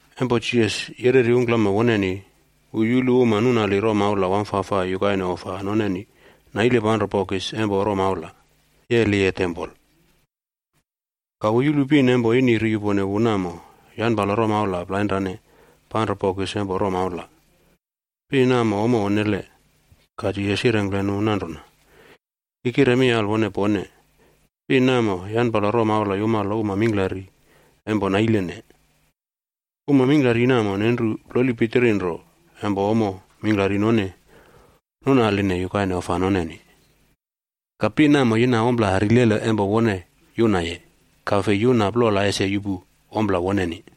Empo Jisas yereri ungklama woneni, wu yulu uma nunali romaula wamfafai yukaine ofa noneni naile panro bokis empo romaulaa yeliye tempol. Ka wu yulu pin empo ini ri yupone wu namo yanpalo romaula plainrane panro bokis empo romaula. Pin namo ommo onnele. Ka Jisas yirengkle nu nanrona, “Ki kire mi alwone pone, pin namo yanpalo romaula yumalo uma mingklari empo nailene. Uma mingklari namo nenru ploli pitiri nro empo ommo mingklari none nunaline yukaine ofa noneni. Ka pin namo yina ompla rilele empo wone yunaye, ka fei yuna plola ese yuꞌpu ompla woneni.”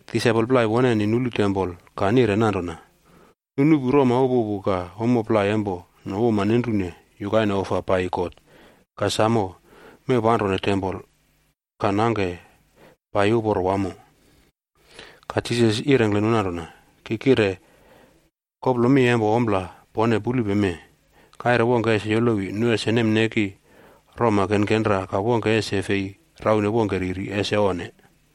Disaipol plai woneni nulu tempol ka nire nanrona, “Nu nuꞌpu roma upupu ka ommo plai empo nu uma nenrune yukaine ofa paiyi God ka samo mewpanrone tempol ka nangke paiyi uporo wamo.” Ka Jisas yirengkle nu nanrona, “Ki kire koplo mi empo ompla pone pulupe mee, kaire wongke ese yolowi nu ese nemneki roma kenkenra ka wongke ese fei raune wongke riri, ese onne!”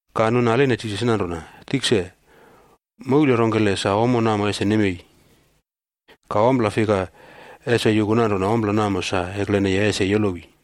Ka nu naline Jisas nanrona, “Tikse, moule rongkele sa ommo namo ese nemei? Ka ompla fika ese yuku nanrona ompla namo sa ekleneye ese yolowi?”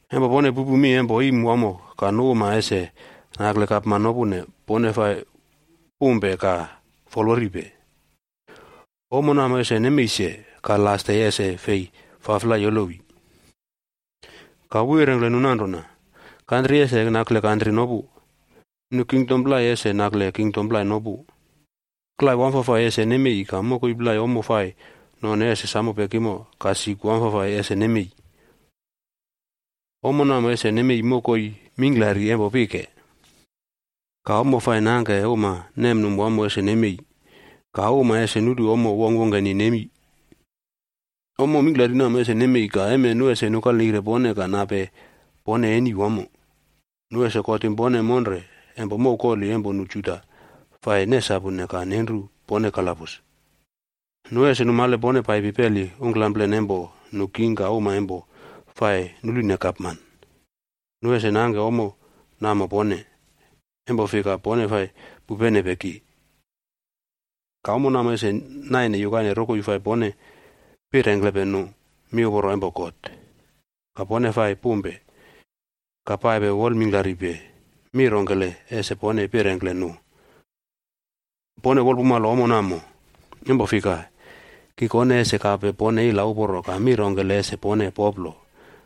Empo pone pupu mi empo iim wamo ka nu uma ese nakle gapman nopune, pone fa pumpe ka folworipe. Ommo namo ese nemei se, ka las de ese fei faflai yolowi.” Ka wu yirengkle nu nanrona, “Kantri ese nakle kantri nopu. Nu kingdom plai ese nakle kingdom plai nopu. Klai wamfafai ese nemei ka mokoi plai ommo fai none ese samo pekimo ka sik wamfafai ese nemei. Ommo namo ese nemei mokoi mingklari empo pike. Ka ommo fai nangke uma nemnum wamo ese nemei. Ka uma ese nulu ommo wongkwongkeni nemi. “Ommo mingklari namo ese nemei, ka emen nu ese nukalneire pone ka nape pone eni wamo. Nu ese kotim pone monre empo mow koli empo nu Juda fai nesapune ka nenru pone kalabus. Nu ese numale pone paipi peli ungklamplen empo nu king ka uma empo fa nulune gapman, nu ese nangke ommo namo pone, empo fika, pone fa pupenepe ki. Ka ommo namo ese naine yukaine rokoi fai pone pirengklepe nu miuporo empo God. Ka pone fai pumpe, ka paipe wol mingklaripe mi rongkele ese pone pirengkle nu. Pone wolpumalo ommo namo. Empo fika, ki kone ese kape pone ila uporo ka mi rongkele ese pone poplo,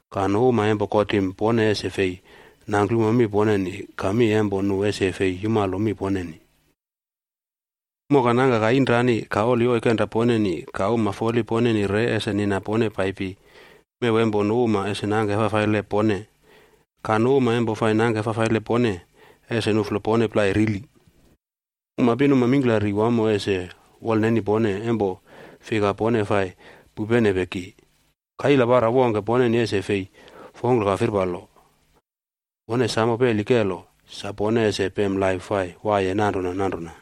ka nu uma empo kotim pone ese fei nangklumo mi poneni ka mi empo nu ese fei yumalo mi poneni. Moka nangka ka inrani ka oli oikenra poneni ka uma foli poneni re ese nina pone paipi mew empo nu uma ese nangke fafaile pone. Ka nu uma empo fa nangke fafaile pone ese nuꞌflo pone plai rili. Uma pinuma mingklari wamo ese wolneni pone, empo fika pone fai pupenepe ki. Ka ila para wongke poneni ese fei fongklo ka firpalo. Pone samo peli kelo sa pone ese pem laip fai waiye nanrona nanrona.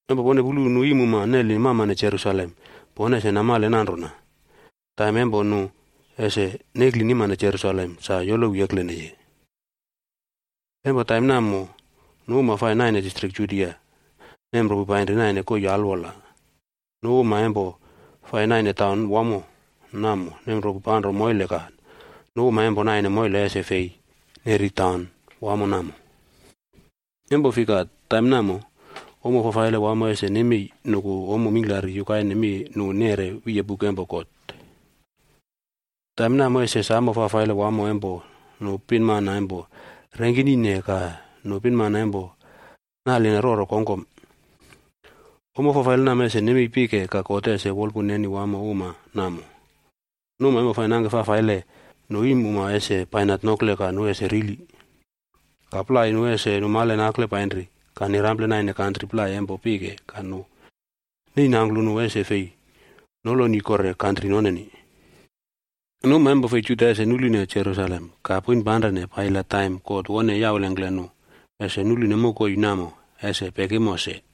“Empo pone pulu nu iimuma neli mamane Jerusalem, pone ese namale nanrona taim empo nu ese neklinimane Jerusalem sa yolowi ekleneye. Empo taim namo nu uma fai naine distrik Judia nemropu panri naine koii alwola. Nu uma empo fai naine taun wamo namo nemropu panro moile ka nu uma empo naine moile ese fei neri taun wamo namo. Empo fika taim namo, ommo fafaile wamo ese nemei nuku ommo mingklari yukaine mi nu neꞌre wiye buk empo God. Taim namo ese samo fafaile wamo empo nu pinmana empo rengkinine ka nu pinmana empo naline roro kongkom. Ommo fafaile namo ese nemei pike ka God ese wolpun neni wamo uma namo. Nu uma empo fai nangke fafaile, nu iimuma ese bainat nokle ka nu ese rili, ka plai nu ese numale nakle painri ka nirample naine kantri plai empo pike ka nu neinangklu nu ese fei noloni kore kantri noneni. Nu uma fei Juda ese nulune Jerusalem ka poinpanrene paiyi la taim God wone yaulengkle nu ese nulune mokoi namo ese pekimo se.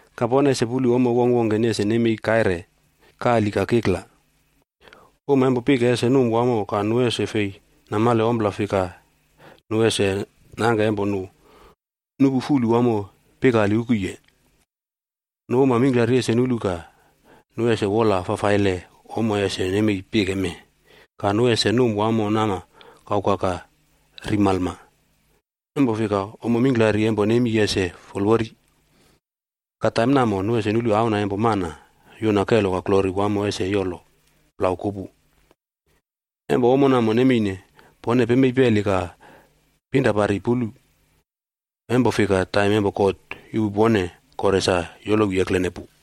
“Ka pone ese pulu ommo wongkwongkeni ese nemei kaire, kali ka kikla. Uma empo pike ese num wamo ka nu ese fei namale ompla fika nu ese nangke empo nu nupu fulu wamo pikali ukuye. Nu uma mingklari ese nulu ka nu ese wola fafaile ommo ese nemei pike mee, ka nu ese num wamo nama kauka ka ri malma, empo fika, ommo kelo mingklari empo nemi ese folwori. Ka taim namo nu ese nulu Auna empo Mana yuna kelo ka glori wamo ese yolo plau kupu. Empo ommo namo nemeine, pone pemei peli ka pinrapari pulu, empo fika taim empo God yuꞌpu pone kore sa yolowi eklene pu.”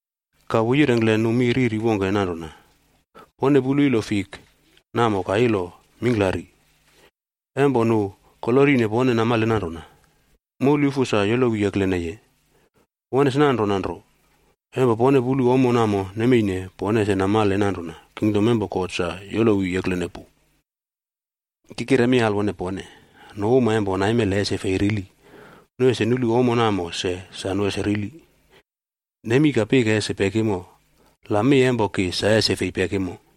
Ka wu yirengkle nu mi riri wongke nanrona, “Pone pulu ilo fikb namo ka ilo mingklari. Empo nu kolorine pone namale nanrona, moulyufu sa yolowi ekleneye. Won ese nanrona nro empo pone pulu ommo namo nemeine, pone ese namale nanrona kingdom empo God sa yolowi eklene pu. “Ki kire mi alwone pone, nu uma empo naimele ese fei rili, nu ese nulu ommo namo se sa nu ese rili. Nemi ka pike ese pekimo, la mi empo ki sa ese fei pekimo.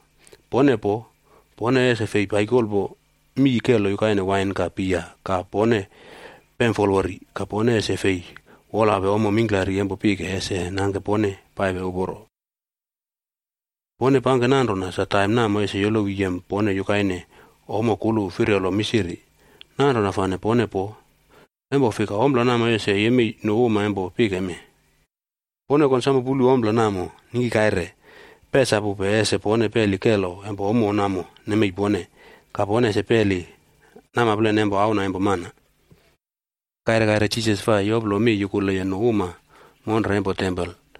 “Pone poo, pone ese fei paikolpo mii kelo yukaine wain ka bia ka pone pemfolwori, ka pone ese fei wolape ommo mingklari empo pike ese nangke pone paipe uporo. Pone pangke nanrona sa taim namo ese yolowi yem pone yukaine ommo kulu firyolo misiri. Nanrona fane pone poo. Empo fika ompla namo ese yemei nu uma empo pike mee. Pone konsamo pulu ompla namo ningki kaire, pesapupe ese pone peli kelo empo ommo namo nemei pone, ka pone ese peli namaplen empo Auna empo Mana.” Kaire kaire Jisas fai yoplo mi yukuleye nu uma monre empo tempol.